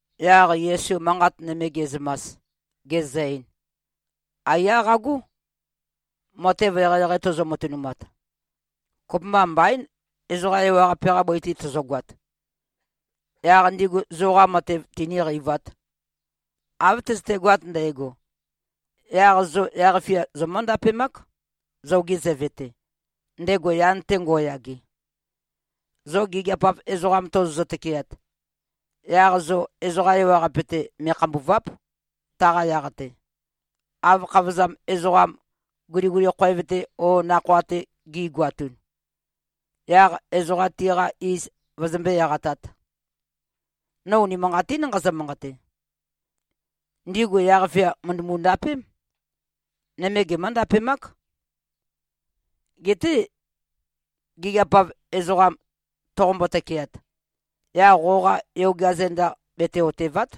Yaq Yesu manqat nøme ge꞉zømas, gezø-ein, “Aiyá qagó. Matev eqeieqei tozo-matønumat, kopømba mbaín, ezoqa ewaqape-qa bøi-te tozogoat, yaq ndigu zoqa matev tinīqeivāt. Av tøzøtegoat ndægo, yaq zo yaq-fia zomǿ-ndapemák, zoge Zøve-te, ndego yan-te ngo꞉yage. Zo gigiap-av ezoqam tozozø-tøkeat, yaq zo ezoqa ewaqape-te me꞉khambùva᷄p, taqa yaq-te, av khavozam ezoqam guliguli khoev-te o nakhoa-te gi꞉goatun, yaq ezoqa tiqa iz vøzømbé-eqatāt. No unimanqatín nqazø-manqate: Ndigu yaq-fia mø̀ndømu-ndapém. Nøme gemǿ-ndapemák. Geté gigiap-av ezoqam toqombo-tøkeat, yaq qoqa yogea zenda bete-otèva᷄t,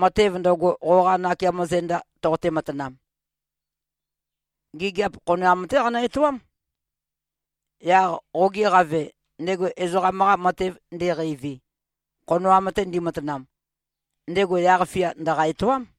matev ndøgo, qoqa nakeamo zenda ndoqote-matanam. Gigiap khonoam-té qanø-etoám. Yaq qoge Qave, ndego ezoqam-qa matev ndeqeivi, khonoam-te ndimatanam, ndego yaq-fia ndø̀qa-etoám.”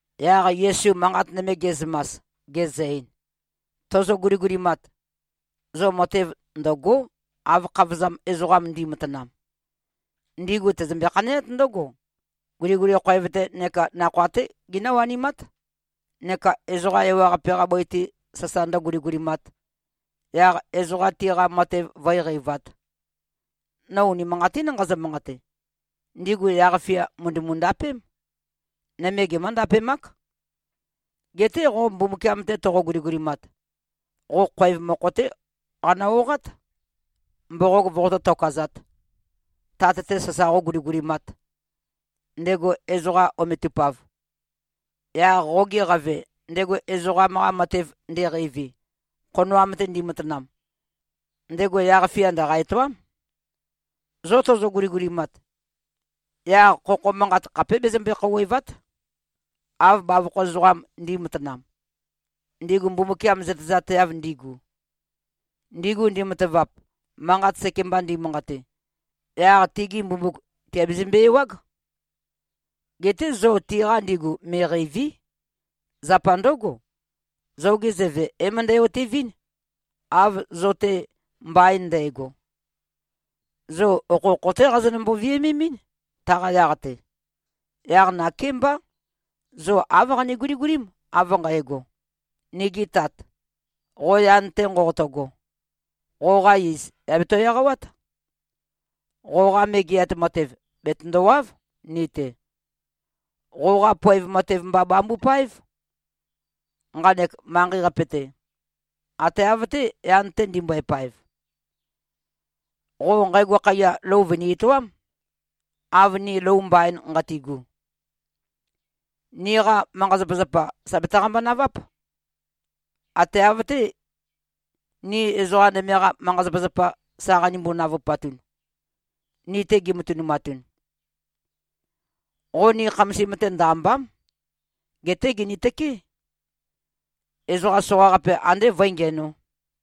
Yaq Yesu manqat nøme ge꞉zømas, gezø-ein, “Tozo-guligulimat, zo matev ndø̀go᷄, av khavozam ezoqam ndi꞉matanam. Ndigu tøzømbe-khaneát ndǿgo: Guliguli khoev-tē neka nakhoa-té ginǿ-wanimát, neka ezoqa ewaqape-qa bøi-te sasa ndǿguligulimāt, yaq ezoqa tiqa matev vǿe-qeivāt. No unimanqatín nqazø-manqate: Ndigu yaq-fia mø̀ndømu-ndapém. Nøme gemǿ-ndapemák. Geté qo Mbumbukiam-te toqo-guligulimat, qo khoev mokho-té qanø-oqát, mboqog voqotó-tokazāt, Tat-te sasa qóguligulimāt, ndego ezoqam ometupav. Yaq qoge Qave, ndego ezoqam-qa matev ndeqeivi, khonoam-te ndimatanam, ndego yaq-fia ndø̀qa-etoám. Zo tozo-guligulimat, yaq khokho manqat khapé bezømbe-khouwèva᷄t, av bavokho ezoqam ndi꞉matanam, ndigu Mbumbukiam zøtezateav ndigu. Ndigu ndimatavap, manqat seke-mba ndimanqate, yaq tigi mbumbuk tìabezømbe-ewág. Geté zo tiqa ndigu me꞉qeìvi᷄. Zapa ndǿgo, zoge Zøve é-møndæ-otevɨ́n, av zo-te mbain ndægo. Zo okhokho-té qazonømbo-viømemɨ́n, taqa yaq-te. Yaq nakémbá, zo āv qane-guligulím, av nqægo: ‘Nigi Tat, qo yan-te nqoqoto꞉go. Qoqa iz, yà beto-eqawát. Qoqa Megeat Matev bètøndowáv ni-te. Qoqá poev matev mba bambupáev, nqanek manqei-qape-te, ate av-té, yan-te ndimbøe-paev. Qo nqægo khaiya lou vø̀ni-etoám, av ni lou mbain nqati꞉gu. Niqa manqa-zapazapa, sà betaqambo-naváp, ate av-té, ni ezoqa nøme-qa manqa-zapazapa sa qanimbo-navupatun, ni-te gimatønumatun. Qo ni khamasim-te ndø-àmba᷄m. Geté gìnitøkeé, ezoqa soqaqape andé vǿe-ngiænō.’”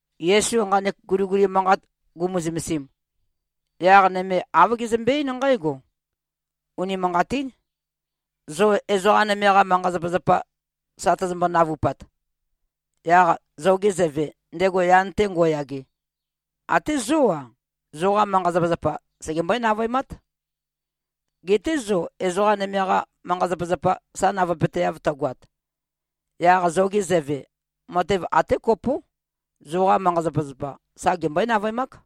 Yesu nqanek guliguli manqat gumu-zømesim, yaq nøme āv gezømbe-eín nqǽgo, “Unimanqatín. Zo ezoqa nøme-qa manqa-zapazapa sa tøzømbo-navupat, yaq zoge Zøve, ndego yan-te ngo꞉yage, até zó-a, zoqa manqa-zapazapa segembøé-navøemát. Geté zo ezoqa nøme-qa manqa-zapazapa sa navøepøteav tøgoat, yaq zoge Zøve, matev até kopó, zoqa manqa-zapazapa, sa gembøé-navøemák.”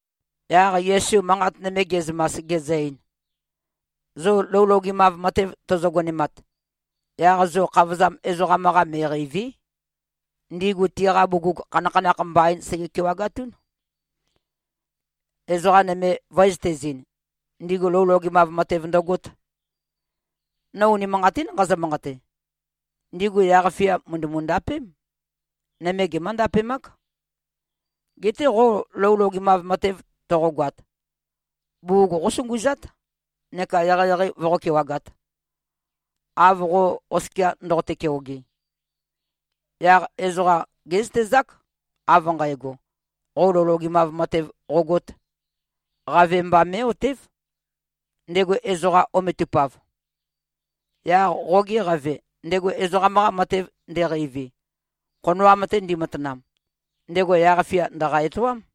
Yaq Yesu manqat nøme ge꞉zømas, gezø-ein, “Zo lou logemav matev tozo-gonemat, yaq zo khavozam ezoqam-qa me꞉qeìvi᷄. Ndigu tiqa bugug, khanakhanakh mbaín sege-kewagatún, ezoqa nøme vǿezøtezīn, ndigu lou logemav matev ndøgōt. No unimanqatín nqazø-manqate. Ndigu yaq-fia mø̀ndømu-ndapém. Nøme gemǿ-ndapemák. Geté qo lou logemav matev toqogoat, bugug qósunguzát neka eqeieqei voqó-kewagāt, av qo oskia ndoqote-keoge. Yaq ezoqa gézøtezák, av nqægo, qo lou logemav matev qōgōt. Qave mba mé꞉-otév, ndego ezoqam ometupav. Yaq qoge Qave, ndego ezoqam-qa matev ndeqeivi, khonoam-te ndimatanam, ndego yaq-fia ndø̀qa-etoám.”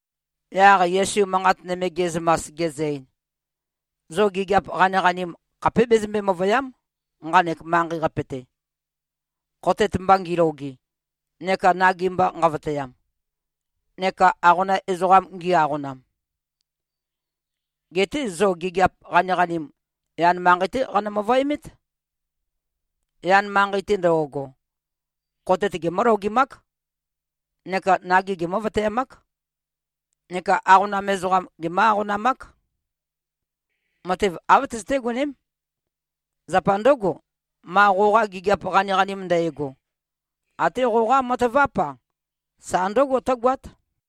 Yaq Yesu manqat nøme ge꞉zømas, gezø-ein, “Zo gigiap qaniqanim khapé bezømbe-møvø̀ya᷄m, nqanek manqei-qape-te, khotet mba ngiloge, neka nagi mba nqavøtøyam, neka aqonam ezoqam ngī-āqōnām. Geté zo gigiap qaniqanim, yan manqei-té qanø-møvøemét. Yan manqei-te ndo꞉go, khotet gemǿ-logemák neka nagi gemǿ-vøtøeamák neka aqonam ezoqam gemǿ-aqonamák. Matev āv tøzøté-goném. Zapa ndǿgo, ma qoqa gigiap qaniqanim ndægo, até qoqa mataváp-a, sa ndǿgo tǿgoát.”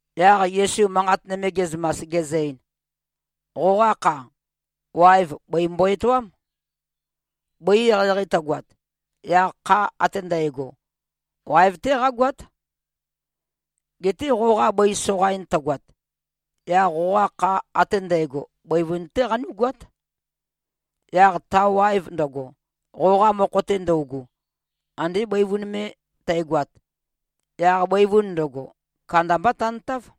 Yaq Yesu manqat nøme ge꞉zømas, gezø-ein, “Qoqa kha, waev bøi mbo-etoám. Bøi eqeieqei tøgoat, yaq kha ate ndægo, waev-té qágoát. Geté qoqa bøi soqain tøgoat, yaq qoqa kha ate ndægo bøivun-té qanú꞉goát. Yaq ta waev ndøgo, qoqa mokho-te ndøugu, ande bøivun me tægoat, yaq bøivun ndøgo, kandambá tantáv.”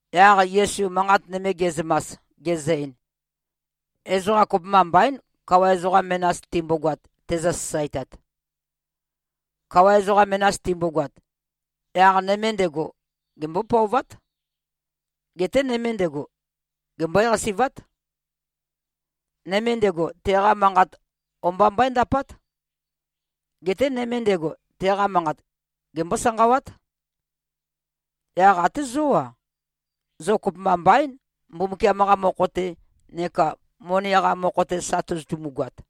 Yaq Yesu manqat nøme ge꞉zømas, gezø-ein, “Ezoqa kopømba mbaín, kawa ezoqa menas timbogoat, tezø-sasaetat. Kawa ezoqa menas timbogoat, yaq nøme ndego, gembó-pøovát. Geté nøme ndego, gembøé-qasi꞉vát. Nøme ndego, teqa manqat o-mba mbøéndapát. Geté nøme ndego, teqa manqat gembó-sanqawát. Yaq até zó-a. Zo kopømba mbaín, Mbumbukiam-qa mokho-te neka moni-qa mokho-te sa tozotumu-goat.”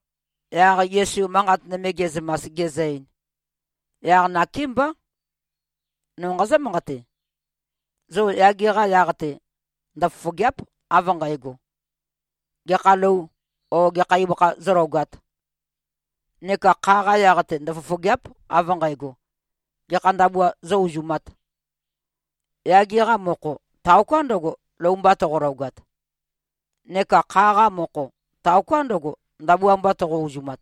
Yaq Yesu manqat nøme ge꞉zømas, gezø-ein, “Yaq nakémbá, no nqazǿ-manqate: Zo yage-qa yaq-te ndøfofògea᷄p, av nqægo, gekha lou o gekha ibøkha zólogāt. Neka kha-qa yaq-te ndøfofògea᷄p, av nqægo, gekha ndabua zó-uzumāt. Yage-qa mokho, taoká ndøgo, lou mba toqologat. Neka kha-qa mokho, taoká ndøgo, ndabua mba toqo-uzumat.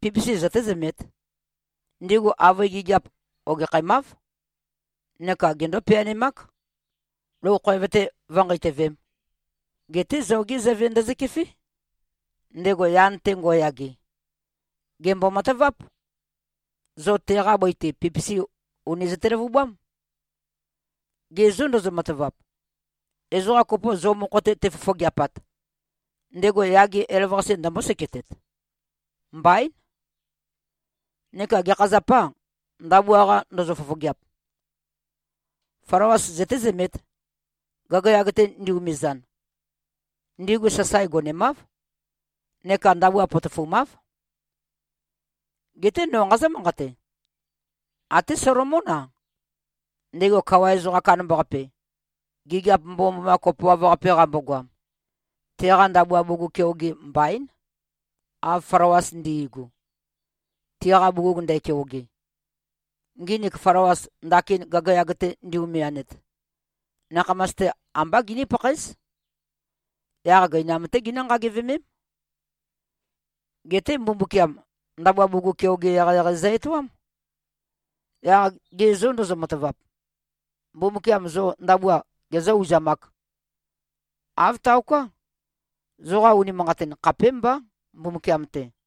Pipisi zøtézømēt. Ndigu avøe gigiap ogekhæmáv, neka gendó-peanemák, lou khoev-te vǿnqeitøvēm. Geté zogé Zøve ndøzøkefé, ndego yan-te ngo꞉yage. Gèmbo-mataváp. Zo teqa bøi-te, pipisi ùni zøte-løvubám. Ge zô ndozo-matavap, ezoqa kopo zo mokho-te tefofogeapat, ndego yage elavøqase ndømbó-seketet? Mbaín! Neka gekha zapâ, ndabua-qa ndozo-fofogeap? Flawas zøtézømēt, gagayag-te ndi-umizan. Ndigu sasae gonemáv neka ndabua potofumáv. Geté no nqazǿ-manqate: Até Solomón-a, ndego kawa ezoqam kandambaqape, gigiap mbomømboma kopoav-qape qambogoam, teqa ndabua bugug keoge mbaín, av flawas ndi꞉gu, tiqa bugug ndækeoge. Nginik flawas, ndakin gagayag-te ndi-umianet, nakhamas-te ambá giní-pakhaéz. Yaq gøinam-té ginǿ-nqagivemém. Geté Mbumbukiam ndabua bugug keoge eqeieqei zø-etoám. Yaq ge zô ndozo-matavap, Mbumbukiam zo ndabua gezǿ-uzamāk? Āv taoká. Zoqa unimanqatin khapémbá, Mbumbukiam-te.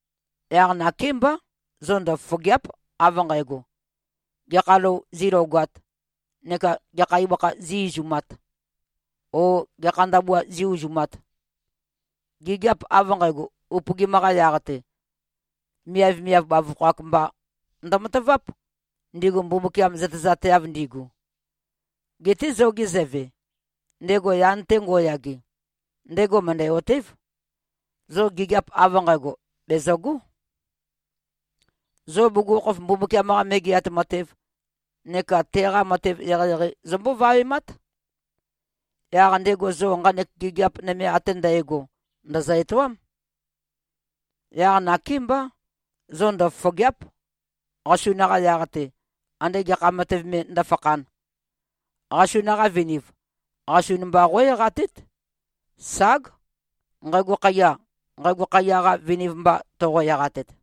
Yaq nakémbá, zo ndøfofògea᷄p, av nqægo, ‘Gekha lou zílogāt?’ neka ‘Gekha ibøkha zí-izumāt?’ o ‘Gekha ndabua zí-uzumāt?’ Gigiap av nqægo upøgim-qa yaq-te, miavmiav bavokho-ak mba ndømataváp, ndigu Mbumbukiam zøtezateav ndigu. Geté zoge Zøve, ndego yan-te ngo꞉yage, ndego mø̀ndæ-otév, zo gigiap av nqægo bèzøgó. Zo bugukhokhof Mbumbukiam-qa Megeat Matev neka teqa matev eqeieqei zombó-vawemát. Yaq ndego zo nqanek gigiap nøme ate ndægo ndø̀zø-etoám. Yaq nakémbá, zo ndøfofògea᷄p, qasun-qa yaq-te, andé gekha matev me ndǿfakhān. Qasun-qa viniv qasun mba qó-eqatét. Ság, nqægo khaiya, nqægo khaiya-qa viniv mba toqo-eqatet.”